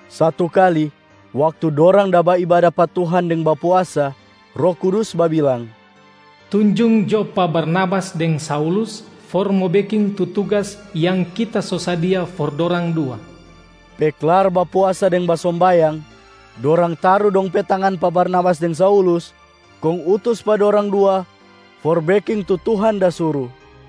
Satu kali, waktu dorang da baibada pa Tuhan deng bapuasa, Roh Kudus babilang, “Tunjung jo pa Barnabas deng Saulus for mo beking tu tugas yang Kita so sadia for dorang dua.” Pe klar bapuasa deng basombayang, dorang taru dong pe tangan pa Barnabas deng Saulus kong utus pa dorang dua for beking tu Tuhan da suru.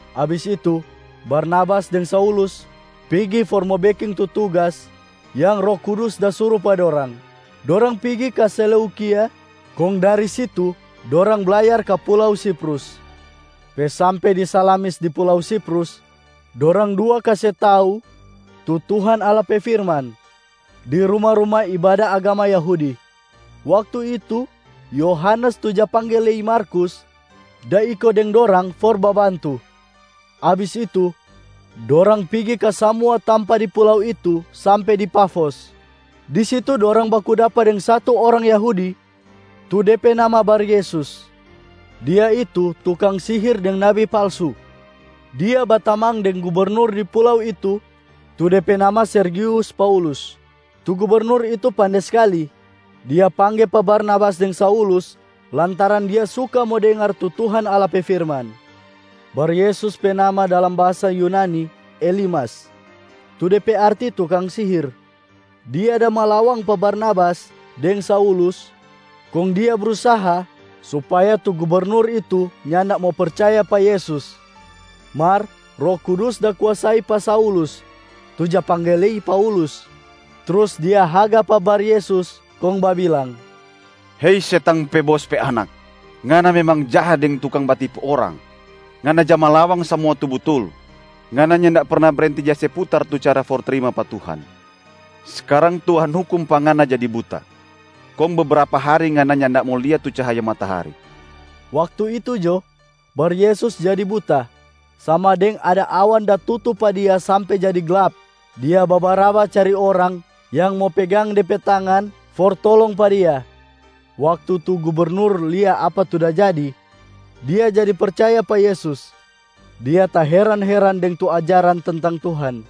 Abis itu, Barnabas deng Saulus pigi for mo beking tu tugas yang Roh Kudus da suru pa dorang. Dorang pigi ka Seleukia, kong dari situ dorang blayar ka pulau Siprus. Pe sampe di Salamis di pulau Siprus, dorang dua kase tau tu Tuhan Allah pe firman di ruma-ruma ibada agama Yahudi. Waktu itu Yohanes tu ja pangge lei Markus da iko deng dorang for babantu. Abis itu, dorang pigi ka samua tampa di pulau itu sampe di Pafos. Di situ dorang baku dapa deng satu orang Yahudi, tu de pe nama Baryesus. Dia itu tukang sihir deng nabi palsu. Dia batamang deng gubernur di pulau itu, tu de pe nama Sergius Paulus. Tu gubernur itu pande skali. Dia pangge pa Barnabas deng Saulus lantaran dia suka mo dengar tu Tuhan Allah pe firman. Baryesus pe nama dalam bahasa Yunani Elimas, tu de pe arti tukang sihir. Dia da malawang pa Barnabas deng Saulus, kong dia brusaha supaya tu gubernur itu nyanda mo percaya pa Yesus. Mar Roh Kudus da kuasai pa Saulus tu ja pangge lei Paulus. Trus dia haga pa Baryesus kong babilang, “Hei setang pe bos pe anak! Ngana memang jaha deng tukang batipu orang. Ngana ja malawang samua tu butul. Ngana nyanda perna brenti ja se putar tu cara for trima pa Tuhan. Skarang, Tuhan hukum pa ngana jadi buta. Kong bebrapa hari ngana nyanda mo lia tu cahaya matahari.” Waktu itu jo, Baryesus jadi buta, sama deng ada awan da tutu pa dia sampe jadi glap. Dia babaraba cari orang yang mo pegang de pe tangan for tolong pa dia. Waktu tu gubernur lia apa tu da jadi, dia jadi percaya pa Yesus. Dia taheran-heran deng tu ajaran tentang Tuhan.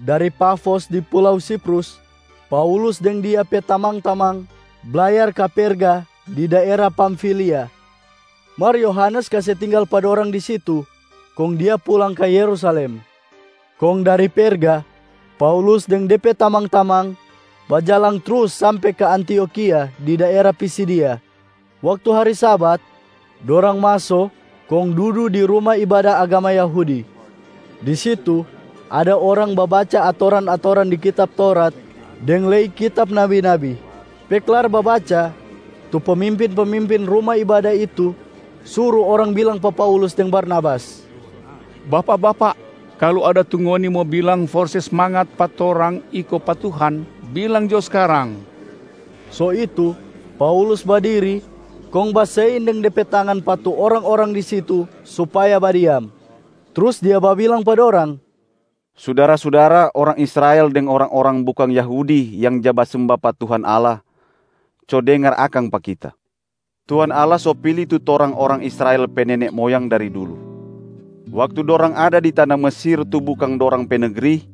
Dari Pafos di pulau Siprus, Paulus deng dia pe tamang-tamang blayar ka Perga di daera Pamfilia. Mar Yohanes kase tinggal pa dorang di situ kong dia pulang ka Yerusalem. Kong dari Perga, Paulus deng de pe tamang-tamang bajalang trus sampe ka Antiokhia di daera Pisidia. Waktu hari Sabat, dorang maso kong dudu di ruma ibada agama Yahudi. Di situ, ada orang babaca atoran-atoran di kitab Taurat deng lei kitab nabi-nabi. Pe klar babaca, tu pemimpin-pemimpin ruma ibada itu suru orang bilang pa Paulus deng Barnabas, “Bapak-bapak, kalu ada tu ngoni mo bilang for se smangat pa torang iko pa Tuhan, bilang jo skarang!” So itu, Paulus badiri kong basein deng de pe tangan pa tu orang-orang di situ supaya badiam. Trus dia babilang pa dorang, “Sudara-sudara orang Israel deng orang-orang bukang Yahudi yang ja basemba pa Tuhan Allah, co dengar akang pa kita! Tuhan Allah so pili tu torang orang Israel pe nene moyang dari dulu. Waktu dorang ada di tana Mesir tu bukang dorang pe negri,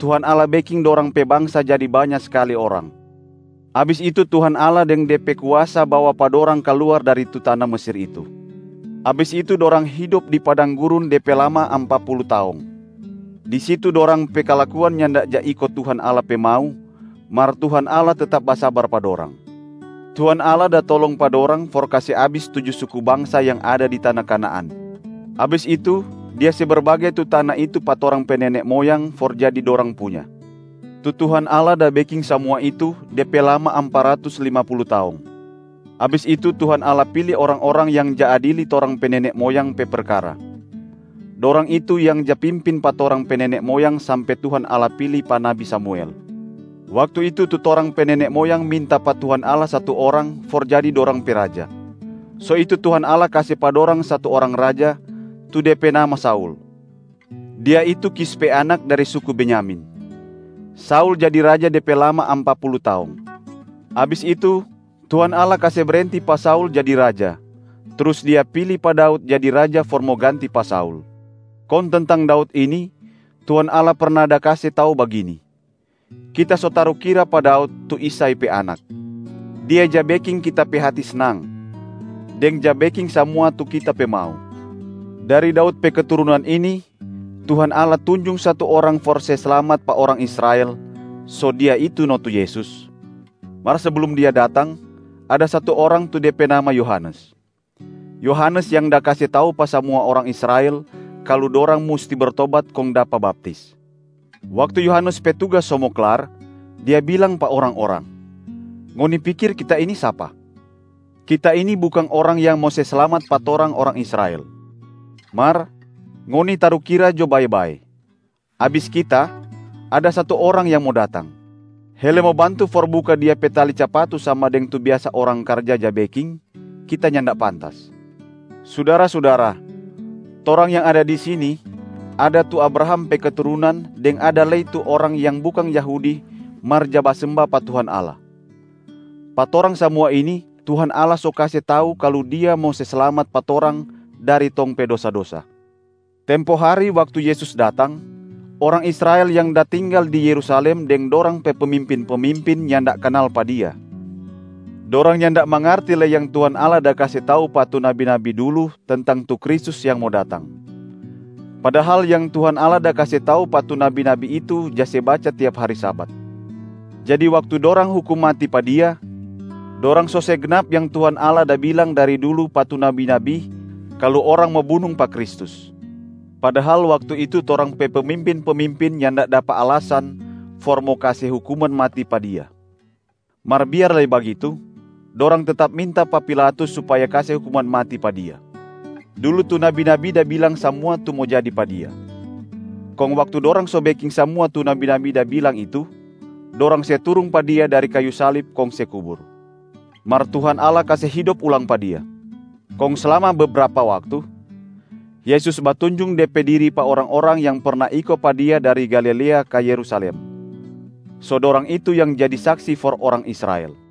Tuhan Allah beking dorang pe bangsa jadi banya skali orang. Abis itu, Tuhan Allah deng De pe kuasa bawa pa dorang kaluar dari tu tana Mesir itu. Abis itu, dorang hidop di padang gurun de pe lama ampa pulu taong. Di situ dorang pe kalakuan nyanda ja iko Tuhan Allah pe mau, mar Tuhan Allah tetap basabar pa dorang. Tuhan Allah da tolong pa dorang for kase abis tuju suku bangsa yang ada di tana Kanaan. Abis itu, Dia se berbage tu tana itu pa torang pe nene moyang for jadi dorang punya. Tu Tuhan Allah da beking samua itu, de pe lama ampa ratus lima pulu taong. Abis itu, Tuhan Allah pili orang-orang yang ja adili torang pe nene moyang pe perkara. Dorang itu yang ja pimpin pa torang pe nene moyang sampe Tuhan Allah pili pa nabi Samuel. Waktu itu, tu torang pe nene moyang minta pa Tuhan Allah satu orang for jadi dorang pe raja. So itu Tuhan Allah kase pa dorang satu orang raja, tu de pe nama Saul. Dia itu Kish pe anak, dari suku Benyamin. Saul jadi raja de pe lama ampa pulu taong. Abis itu, Tuhan Allah kase brenti pa Saul jadi raja, trus Dia pili pa Daud jadi raja for mo ganti pa Saul. Kong tentang Daud ini, Tuhan Allah perna da kase tau bagini, ‘Kita so tarukira pa Daud tu Isai pe anak. Dia ja beking Kita pe hati snang, deng ja beking samua tu Kita pe mau.’ Dari Daud pe keturunan ini, Tuhan Allah tunjung satu Orang for se slamat pa orang Israel, so Dia itu no tu Yesus. Mar seblum Dia datang, ada satu orang tu de pe nama Yohanes. Yohanes yang da kase tau pa samua orang Israel kalu dorang musti bertobat kong dapa baptis. Waktu Yohanes pe tugas so mo klar, dia bilang pa orang-orang, ‘Ngoni pikir kita ini sapa? Kita ini bukang Orang yang mo se slamat pa torang orang Israel. Mar, ngoni tarukira jo bae-bae. Abis kita, ada satu Orang yang mo datang. Hele mo bantu for buka Dia pe tali capatu sama deng tu biasa orang karja ja beking, kita nyanda pantas.’ Sudara-sudara, torang yang ada di sini, ada tu Abraham pe keturunan deng ada lei tu orang yang bukang Yahudi mar ja basemba pa Tuhan Allah. Pa torang samua ini Tuhan Allah so kase tau kalu Dia mo se slamat pa torang dari tong pe dosa-dosa. Tempo hari waktu Yesus datang, orang Israel yang da tinggal di Yerusalem deng dorang pe pemimpin-pemimpin nyanda kanal pa Dia. Dorang nyanda mangarti lei yang Tuhan Allah da kase tau pa tu nabi-nabi dulu tentang tu Kristus yang mo datang. Padahal yang Tuhan Allah da kase tau pa tu nabi-nabi itu ja se baca tiap hari Sabat. Jadi waktu dorang hukum mati pa Dia, dorang so se gnap yang Tuhan Allah da bilang dari dulu pa tu nabi-nabi kalu orang mo bunung pa Kristus. Padahal waktu itu torang pe pemimpin-pemimpin nyanda dapa alasan for mo kase hukuman mati pa Dia. Mar biar lei bagitu, dorang tetap minta pa Pilatus supaya kase hukuman mati pa Dia. Dulu tu nabi-nabi da bilang samua tu mo jadi pa Dia. Kong waktu dorang so beking samua tu nabi-nabi da bilang itu, dorang se turung pa Dia dari kayu salib kong se kubur. Mar Tuhan Allah kase hidop ulang pa Dia. Kong slama bebrapa waktu, Yesus batunjung De pe diri pa orang-orang yang perna iko pa Dia dari Galilea ka Yerusalem. So dorang itu yang jadi saksi for orang Israel.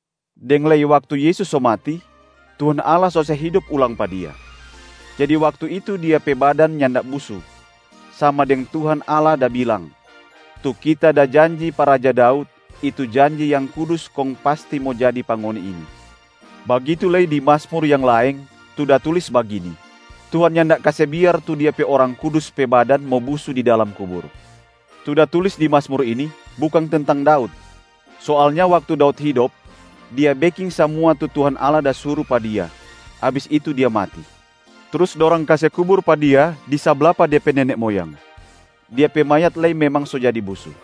Deng lei waktu Yesus so mati, Tuhan Allah so se hidop ulang pa Dia. Jadi waktu itu Dia pe badan nyanda busu, sama deng Tuhan Allah da bilang, ‘Tu Kita da janji pa raja Daud, itu janji yang Kudus kong pasti mo jadi pa ngoni ini.’ Bagitu lei di Mazmur yang laeng, tu da tulis bagini, ‘Tuhan nyanda kase biar tu Dia pe Orang Kudus pe badan mo busu di dalam kubur.’ Tu da tulis di Mazmur ini, bukang tentang Daud. Soalnya waktu Daud hidop, dia beking samua tu Tuhan Allah da suru pa dia, abis itu dia mati. Trus dorang kase kubur pa dia di sabla pa de pe nene moyang. Dia pe mayat lei memang so jadi busu.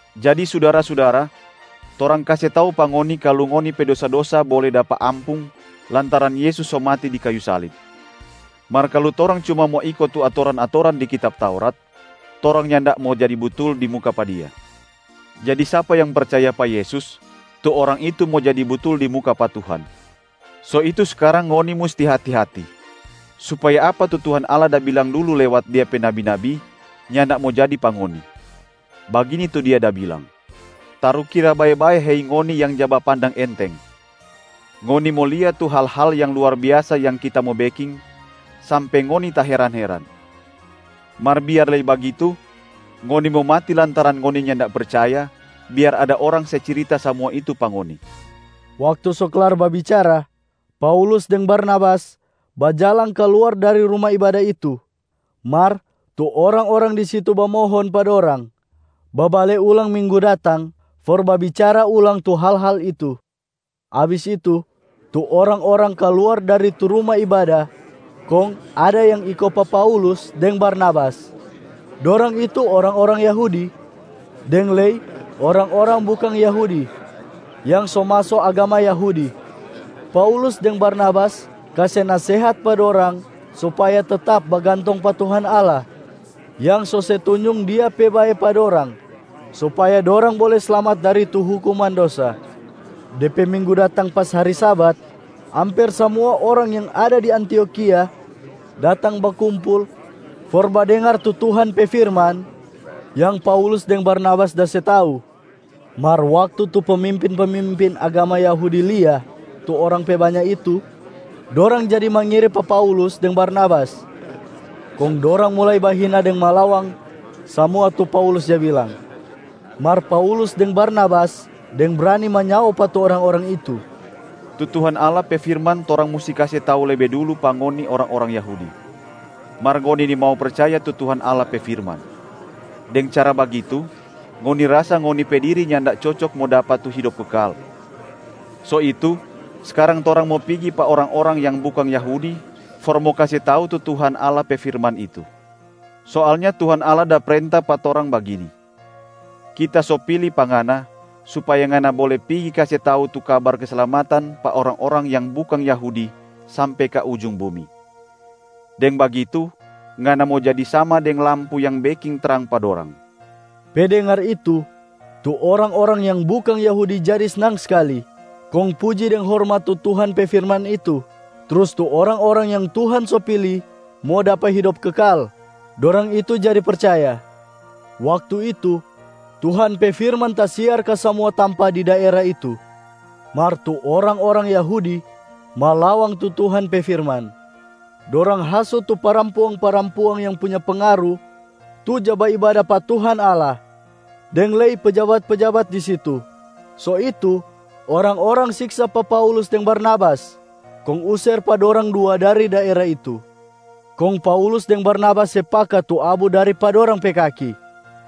Jadi sudara-sudara, torang kase tau pa ngoni kalu ngoni pe dosa-dosa bole dapa ampung lantaran Yesus so mati di kayu salib. Mar kalu torang cuma mo iko tu atoran-atoran di kitab Taurat, torang nyanda mo jadi butul di muka pa Dia. Jadi sapa yang percaya pa Yesus, tu orang itu mo jadi butul di muka pa Tuhan. So itu skarang ngoni musti hati-hati, supaya apa tu Tuhan Allah da bilang dulu lewat Dia pe nabi-nabi nyanda mo jadi pa ngoni. Bagini tu Dia da bilang, ‘Tarukira bae-bae hei ngoni yang ja bapandang enteng. Ngoni mo lia tu hal-hal yang luar biasa yang kita mo beking, sampe ngoni taheran-heran. Mar biar lei bagitu ngoni mo mati lantaran ngoni nyanda percaya, biar ada orang se cirita samua itu pa ngoni.’” Waktu so klar babicara, Paulus deng Barnabas bajalang kaluar dari ruma ibada itu. Mar tu orang-orang di situ bamohon pa dorang babale ulang minggu datang for babicara ulang tu hal-hal itu. Abis itu, tu orang-orang kaluar dari tu ruma ibada kong ada yang iko pa Paulus deng Barnabas. Dorang itu orang-orang Yahudi deng lei orang-orang bukang Yahudi yang so maso agama Yahudi. Paulus deng Barnabas kase nasehat pa dorang supaya tetap bagantong pa Tuhan Allah yang so se tunjung Dia pe bae pa dorang supaya dorang bole slamat dari tu hukuman dosa. De pe minggu datang pas hari Sabat, amper samua orang yang ada di Antiokhia datang bakumpul for badengar tu Tuhan pe firman yang Paulus deng Barnabas da se tau. Mar waktu tu pemimpin-pemimpin agama Yahudi lia tu orang pe banya itu, dorang jadi mangiri pa Paulus deng Barnabas. Kong dorang mulai bahina deng malawang samua tu Paulus ja bilang. Mar Paulus deng Barnabas deng brani manyao pa tu orang-orang itu, “Tu Tuhan Allah pe firman torang musti kase tau lebe dulu pa ngoni orang-orang Yahudi. Mar ngoni nimau percaya tu Tuhan Allah pe firman. Deng cara bagitu, ngoni rasa ngoni pe diri nyanda cocok mo dapa tu hidop kekal. So itu, skarang torang mo pigi pa orang-orang yang bukang Yahudi for mo kase tau tu Tuhan Allah pe firman itu. Soalnya Tuhan Allah da prenta pa torang bagini, ‘Kita so pili pa ngana, supaya ngana bole pigi kase tau tu kabar keslamatan pa orang-orang yang bukang Yahudi sampe ka ujung bumi. Deng bagitu, ngana mo jadi sama deng lampu yang beking trang pa dorang.’” Pe dengar itu, tu orang-orang yang bukang Yahudi jadi snang skali kong puji deng hormat tu Tuhan pe firman itu. Trus tu orang-orang yang Tuhan so pili mo dapa hidop kekal, dorang itu jadi percaya. Waktu itu, Tuhan pe firman tasiar ka samua tampa di daera itu. Mar tu orang-orang Yahudi malawang tu Tuhan pe firman. Dorang hasut tu parampuang-parampuang yang punya pengaru tu ja baibada pa Tuhan Allah deng lei pejabat-pejabat di situ. So itu, orang-orang siksa pa Paulus deng Barnabas kong user pa dorang dua dari daera itu. Kong Paulus deng Barnabas se paka tu abu dari pa dorang pe kaki,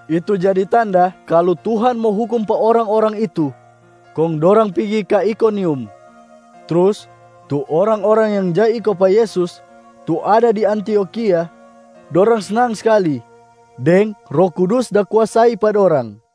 itu jadi tanda kalu Tuhan mo hukum pa orang-orang itu, kong dorang pigi ka Ikonium. Trus tu orang-orang yang ja iko pa Yesus tu ada di Antiokhia, dorang snang skali deng Roh Kudus da kuasai pa dorang.